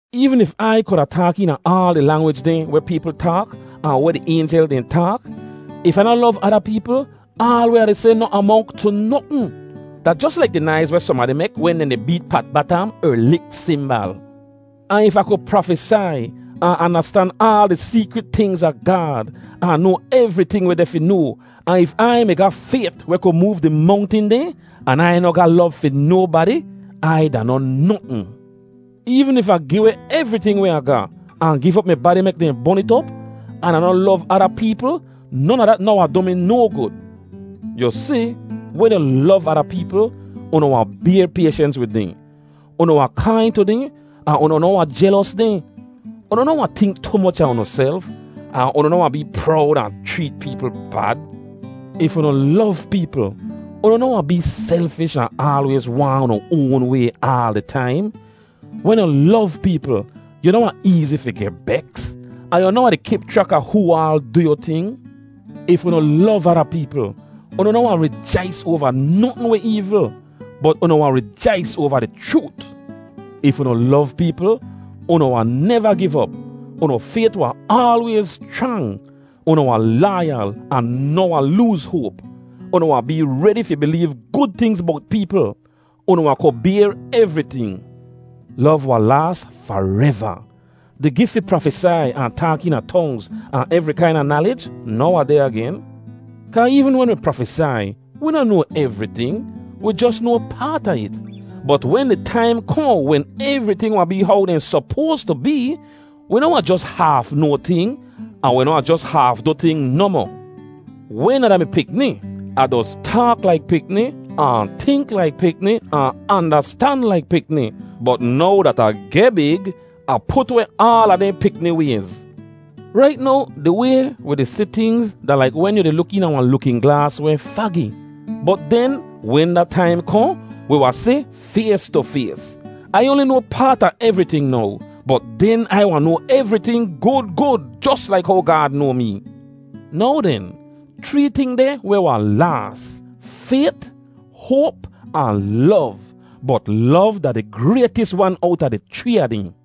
Eevn if Ai kuda taak eena aal di langwij dehn weh peepl taak ahn weh di aynjel dehn taak, if Ah noh lov ada peepl, aal weh Ah di seh noh amonk tu notn. Da jos laik di naiz weh sohnbadi mek wen dehn di beet pat batam er lik simbal. Ahn if Ah ku prafesai, ahn andastan aal di seekrit tingz a Gaad, ahn noa evriting weh deh fi noa, ahn if Ai mi ga fayt weh ku moov di mongtin dehn, an Ai noh ga lov fi nobadi, Ai da noh notn. Eevn if Ah gi weh evriting weh Ah ga, ahn giv op mi badi mek dehn bon it op, an Ah noh lov ada peepl, non a dat noh wahn du mi no gud. Yu si, wen yu lov ada peepl, unu wahn bayr payshens wid dehn. Unu wahn kain tu dehn ahn unu noh wahn jelos dehn. Unu noh wahn tink tu moch a unuself, ahn unu noh wahn bee prowd ahn chreet peepl bad. If unu lov peepl, unu noh wahn bee selfish ahn aalwayz waahn unu oan way aal di taim. Wen yu lov peepl yu noh wahn eezi fi geh beks, ahn yu noh wahn di kip chrak a hoo aal du yu ting. If unu lov ada peepl, unu noh wahn rijais oava notn weh eevl, bot unu wahn rijais oava di chroot. If unu lov peepl, unu wahn neva giv op. Unu fayt wahn aalwayz schrang. Unu wahn laayal ahn noh wahn looz hoap. Unu wahn bee redi fi bileev gud tingz bowt peepl. Unu wahn ku bayr evriting. Lov wahn laas fareva. Di gif fi prafesai, ahn taak eena tongz, ahn evri kaina nalij noh wahn deh agen. Kaa eevn wen wi prafesai, wi noh noa evriting. Wi jos noa paat a it. Bot wen di taim kohn wen evriting wahn bee how dehn sopoas tu bee, wi noh wahn jos haaf noa ting, ahn wi noh wahn jos haaf du ting nohmoh. Wen Ah da-mi pikni, Ah doz taak laik pikni, ahn tink laik pikni, ahn andastan laik pikni. Bot now dat Ah geh big, Ah put weh aala dehn pikni wayz. Rait now di way wi di si tingz da laik wen yu di luk eena wahn lukin glaas weh fagi. Bot den, wen da taim kohn, wi wahn si fays tu fays. Ai oanli noa paat a evriting now, bot den Ai wahn noa evriting gud gud, jos laik how Gaad noa mee. Now den, chree ting deh weh wahn laas: fayt, hoap, ahn lov. Bot lov da di graytis wan owta di chree a dehn.